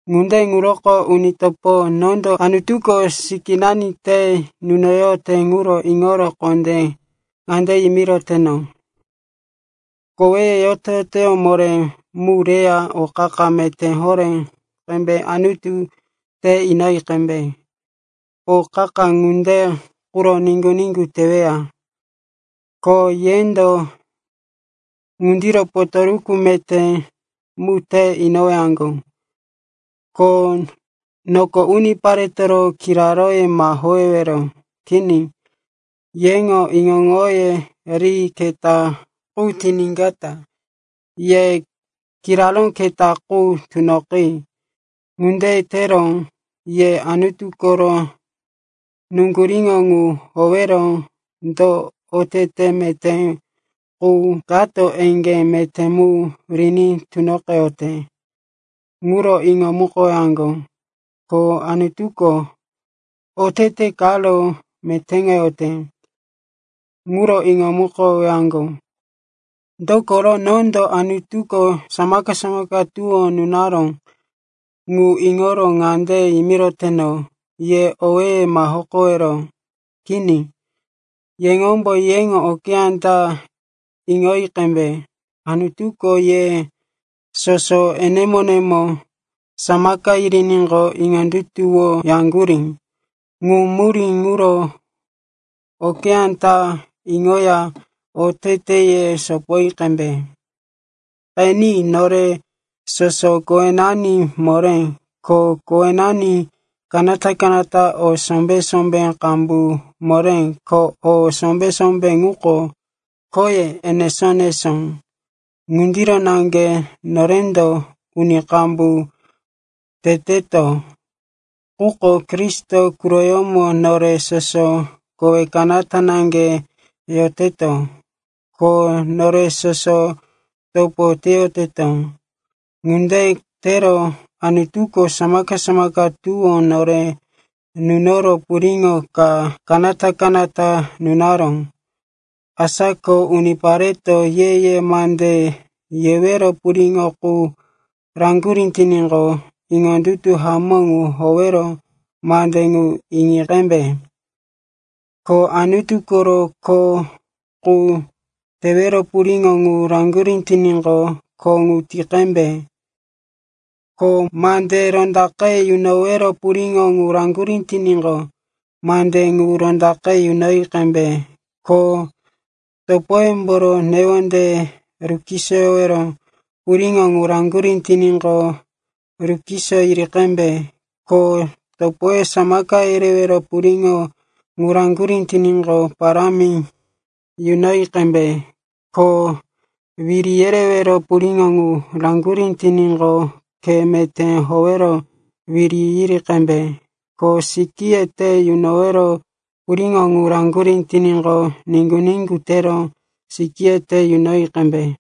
Ŋunde ŋuroko, uni topo, nondo Anutuko sikínani te yunoyote ŋuro iŋoro kondé ŋande yimiroteno, koweye yoto-yoto moré mu reya o qa-qa meté horé qembe Anutu te inoyi qembe. O qa-qa ŋunde quro niŋgu-niŋgu teweya, ko yendo ŋundiro potoruku meté mu te inowaŋgo. Ko noko uniparetoro kiraróye ma howewero. Kini, yeŋo iŋo-iŋoye ri keta qu tiníkata ye kiraró keta qu tunoqi. Ŋunde tero ye Anutu koro nuŋguríŋo ŋu howero do otete meté qu kato eŋgé meté mu riní tunoqeyote ŋuro iŋomukowaŋgo, ko Anutuko otete karo metéŋoyote ŋuro iŋomukowaŋgo. Dokoro nondo Anutuko samaka-samaka tuwó nunaró ŋu iŋoro ŋande yimiroteno, ye owéye ma hokowero. Kini, yeŋombo yeŋo okeyá ta iŋoyi qembe. Anutuko ye soso enemo-enemo samaka yiriníqo, iŋondutuwoyaŋgurí. Ŋu murí ŋuro okeyá ta iŋoya oteteye sopoyi qembe. Qeni, nore soso kowenani moré, ko kowenani kanata-kanata o sombé-sombé qambu moré, ko o sombé-sombé ŋuko khoye enesó-enesó. Ŋundiro naŋge norendo uni qambu teteto, quko Kristo quroyómo nore soso kowe kanata naŋge yoteto, ko nore soso topo teyoteto. Ŋunde tero Anutuko samaka-samaka tuwó nore nunoro puriŋo ka kanata-kanata yunaró. Asa ko unipareto ye-ye mande yewero puriŋo ŋu raŋgurí tiníqo, iŋondutu hamó ŋu howero mande ŋu yi qembe. Ko Anutu koro kho qu tewero puriŋo ŋu raŋgurí tiníqo, kho ŋu ti qembe. Ko mande rondaqe yunowero puriŋo ŋu raŋgurí tiníqo, mande ŋu rondaqe yunoyi qembe. Ko topoyemboro newondeye rukisoyowero puriŋo ŋu raŋgurí tiníqo, rukiso yiri qembe. Ko topoye samaka yerewero puriŋo ŋu raŋgurí tiníqo, parámi yunoyi qembe. Ko wiri yerewero puriŋo ŋu raŋgurí tiníqo, khe meté howero wiri yiri qembe. Ko sikíye te yunowero puriŋo ŋu raŋgurí tiníqo, niŋgu-niŋgu tero sikíye te yunoyi qembe.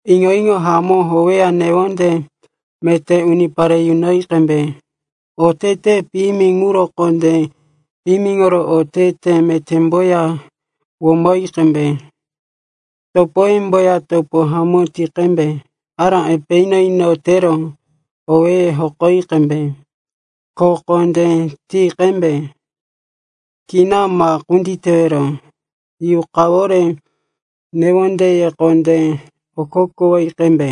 Iŋo-iŋo hamó howeya newonde meté unipare yunoyi qembe. Otete piyimi ŋuro kondé piyimiŋoro otete metémboya womoyi qembe. Topoyemboya topo hamó ti qembe. Ará epe ino-ino tero owéye hokoyi qembe. Kho kondé ti qembe, kina ma kunditewero. Yuqawore newondeye kondé okokowoyi qembe.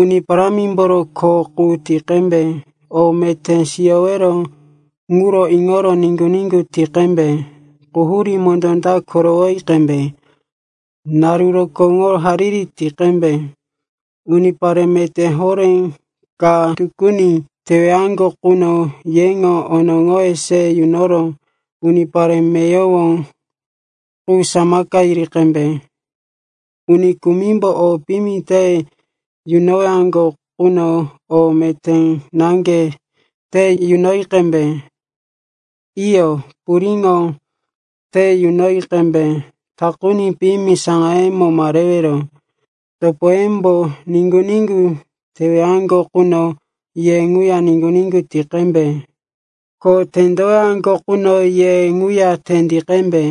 Uni Parámimboro kho qu ti qembe. O meté siyowero ŋuro iŋoro niŋgu-niŋgu ti qembe. Quhurí mondó ta korowoyi qembe. Naru rokóŋo hariri ti qembe. Unipare meté horé ka tukuni tewaŋgo quno yeŋo onoŋoye se yunoro unipare meyowo qu samaka yiri qembe. Uni kumimbo o piyimi te yunowaŋgo quno o meté naŋge te yunoyi qembe. Iyo, puriŋo te yunoyi qembe, takuni piyimi saŋayemo ma rewero. Topoyembo niŋgu-niŋgu tewaŋgo quno ye ŋuya niŋgu-niŋgu ti qembe, ko tendowaŋgo quno ye ŋuya tendi qembe.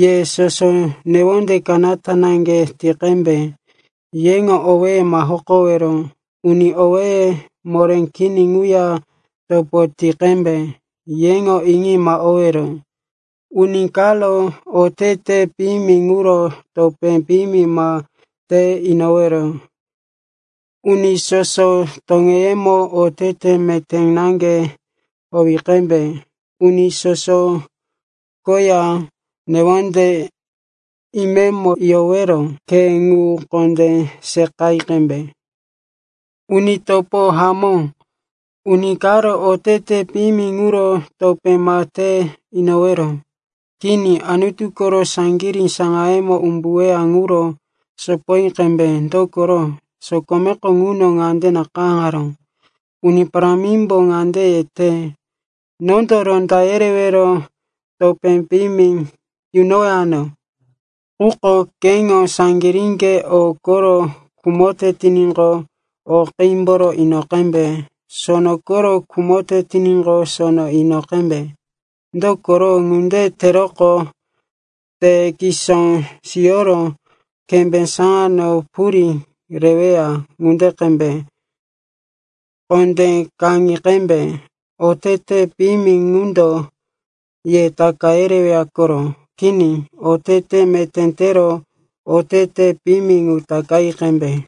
Ye soso newonde kanata naŋge ti qembe. Yeŋo owéye ma hokowero, uni owéye moré kini ŋuya topo ti qembe. Yeŋo iŋi ma owero. Uni karo otete piyimi ŋuro topé piyimi ma te inowero. Uni soso toŋeyemo otete meté naŋge howi qembe. Uni soso koya newonde imemo yorowero khe ŋu kondé seqayi qembe. Uni kopo hamó, uni karo otete piyimi ŋuro topé ma te inowero. Kini, Anutu koro saŋgirí saŋayemo umbuweya ŋuro sopoyi qembe. Dokoro sokomeko ŋuno ŋande nakayáŋaró, “Uni Parámimbo ŋande yete, ‘Nondo ronda yerero topé piyimi yunowano.’” Quko “Keŋo saŋgiríŋge o koro khumote tiníqo, o qímboro ino qembe; sono koro khumote tiníqo, sono ino qembe. Dokoro ŋunde teroqo te kisó siyoro kembé saŋano purí reweya ŋunde qembe.” Kondé kaŋi qembe, otete piyimi ŋundo ye taka yereweya koro. Kini, otete meté tero otete piyimi ŋu takayi qembe.